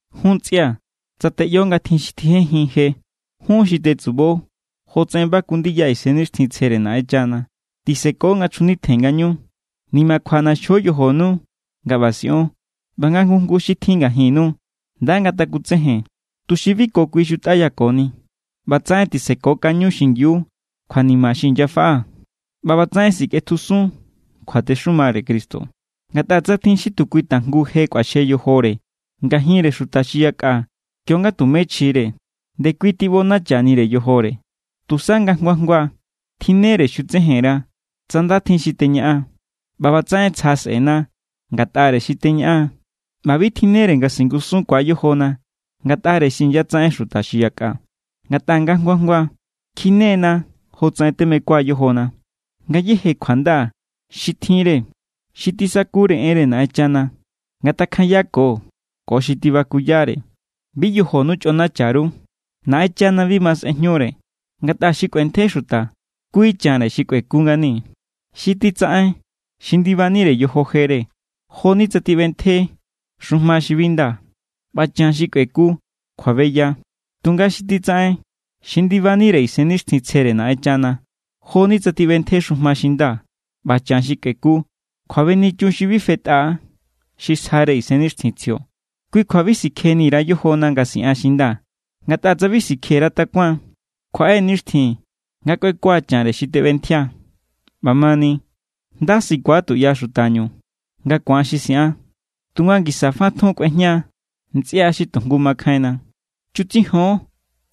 Jun ntsꞌia̱, tsa teꞌyo nga tjin xi tjijenjin je, jun xi tetsubo jotsaꞌen baku ndiya Isennixtjintsjere Naꞌenchana tiseko nga chjunitjen ngañu. Nimakjua ꞌnaxjo yojonu nga ꞌba siꞌon. ꞌBa nga jngu jngu xi tjin ngajinnu nda ngatakutsejen, tuxi bi ko kui xutꞌayakoni. ꞌBatsaꞌen tisekokaño xingiu kjuanima xi inyafaꞌa, ꞌba ꞌbatsaꞌen sikꞌetjusun kjuatexumare Cristo. Ngatꞌa tsa tjin xi tu kui tajngu je kꞌuaxje yojore ngajinre xuta xi yakꞌa kionga tumé chjire, ndekui tiꞌbonachanire yojore. Tusa nga jngua jngua tjinnere xutsejen_ra tsa nda tjin xi teñaꞌan. ꞌBa ꞌbatsaꞌen tsja sꞌe̱na ngatꞌare xi teñaꞌan ꞌba bi tjinnere nga singusunkuaa̱ yojona ngatꞌare xi inyatsaꞌen xuta xi yakꞌa. Ngatꞌa nga jngua jngua kjine=na jotsaꞌen temekua yojona. Ngayéje kjuanda xi tjinre xi tisakuyare enre Naꞌenchana ngatakjanyako ko xi tibakuyare. Bi yojonu chꞌonacha_ru. Naꞌenchana bi ma sꞌejñure. Ngatꞌa xi kꞌuentje xuta, kui chanre xi kꞌueku ngani. Xi titsaꞌen xi ndibanire yojo jere, jo=ni tsa tiꞌbentje xujma xi bi nda. ꞌBa chan xi kꞌueku, kjuabeya. Tunga xi titsaꞌen xi ndibanire Isennixtjintsjere Naꞌenchana, jo=ni tsa tiꞌbentje xujma xi nda. ꞌBa chan xi kꞌueku, kjuabenichun xi bi fetꞌa= xi sjare Isennixtjintsjio. Kui kjua bi sikjejndani_ra yojona nga siꞌan xi nda. Ngatꞌa tsa bi sikje_ra takuan, kjuaꞌe nixtjin nga kꞌuekua chanre xi tiꞌbentjia. ꞌBamani, nda sikua tuꞌya xutañu nga ku̱an xi siꞌan, tunga ngisa fa tjun kꞌuejña ntsꞌia xi tu jngu makjainna. Chutsijon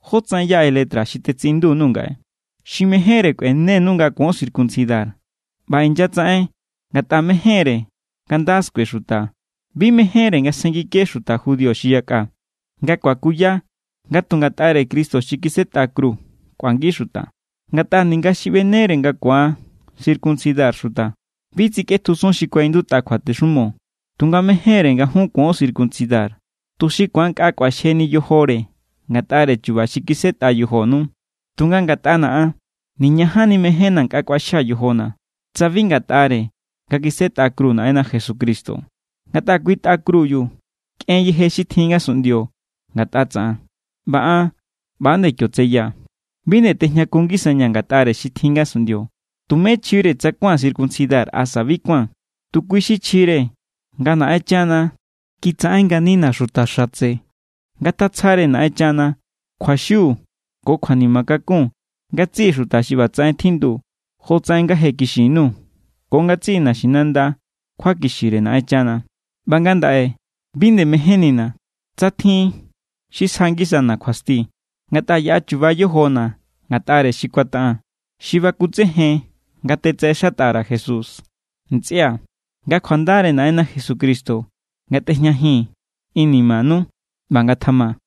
jótsaꞌen yaꞌe letra xi tetsiꞌindu_nuu̱ ngaꞌe. Xi mejénre kꞌuenenu nga kuon circuncidar, ꞌba inyatsaꞌen ngatꞌa mejénre nga nda skue xuta. Bi mejénre nga sjenngike xuta judío xi yakꞌa, nga kuakuya nga tu ngatꞌare Cristo xi kisꞌetꞌa kru kꞌuangi xuta. Ngatꞌa ninga xi ꞌbenere nga ku̱an circuncidar xuta, bi tsikꞌetjusun xi kuaꞌindutꞌa kjuatexumo. Tunga mejénre nga jun kuon circuncidar, tuxi ku̱an nkꞌa kꞌuaxjeni yojore ngatꞌare chu̱ba̱ xi kisꞌetꞌa yojonu. Tunga ngatꞌana̱ an, niñajanni mejénna̱ nkꞌa kꞌuaxjaa̱ yojona̱, tsa bi ngatꞌare nga kisꞌetꞌa kru Naꞌenna Jesucristo. Ngatꞌa kui tꞌa krubiu kꞌen yeje xi tjin ngasunꞌndio ngatꞌa tsaꞌan, ꞌba an ꞌba nde kio tseyaa̱. Bi nde tejñakun ngisañaa̱ ngatꞌare xi tjin ngasunꞌndio. Tumé chjire tsa kuáan circuncidar asa bi kuáan. Tu kui xi chjire nga Naꞌenchana kitsaꞌen nganina xuta xatse. Ngatatsjare Naꞌenchana kjuaxiu ko kjuanima kakun ngatsiꞌi xuta xi ꞌbatsaꞌen tjindu jotsaꞌen nga je kixin_nuu̱ ko ngatsiꞌi naxinanda kjuakixire Naꞌenchana. ꞌBa ngandaꞌe bi nde mejénnina̱ tsa tjin xi sja ngisana̱ kjuasti. Ngatꞌa yaꞌa chuba= yojona̱ ngatꞌare xi kuataꞌaa̱n, xi bakutsejen nga tetsaꞌexatꞌa_ra̱ Jesús. Ntsꞌia̱, nga kjuandare Naꞌenna Jesucristo ngatꞌejñajin inimanu. ꞌBa ngatjama.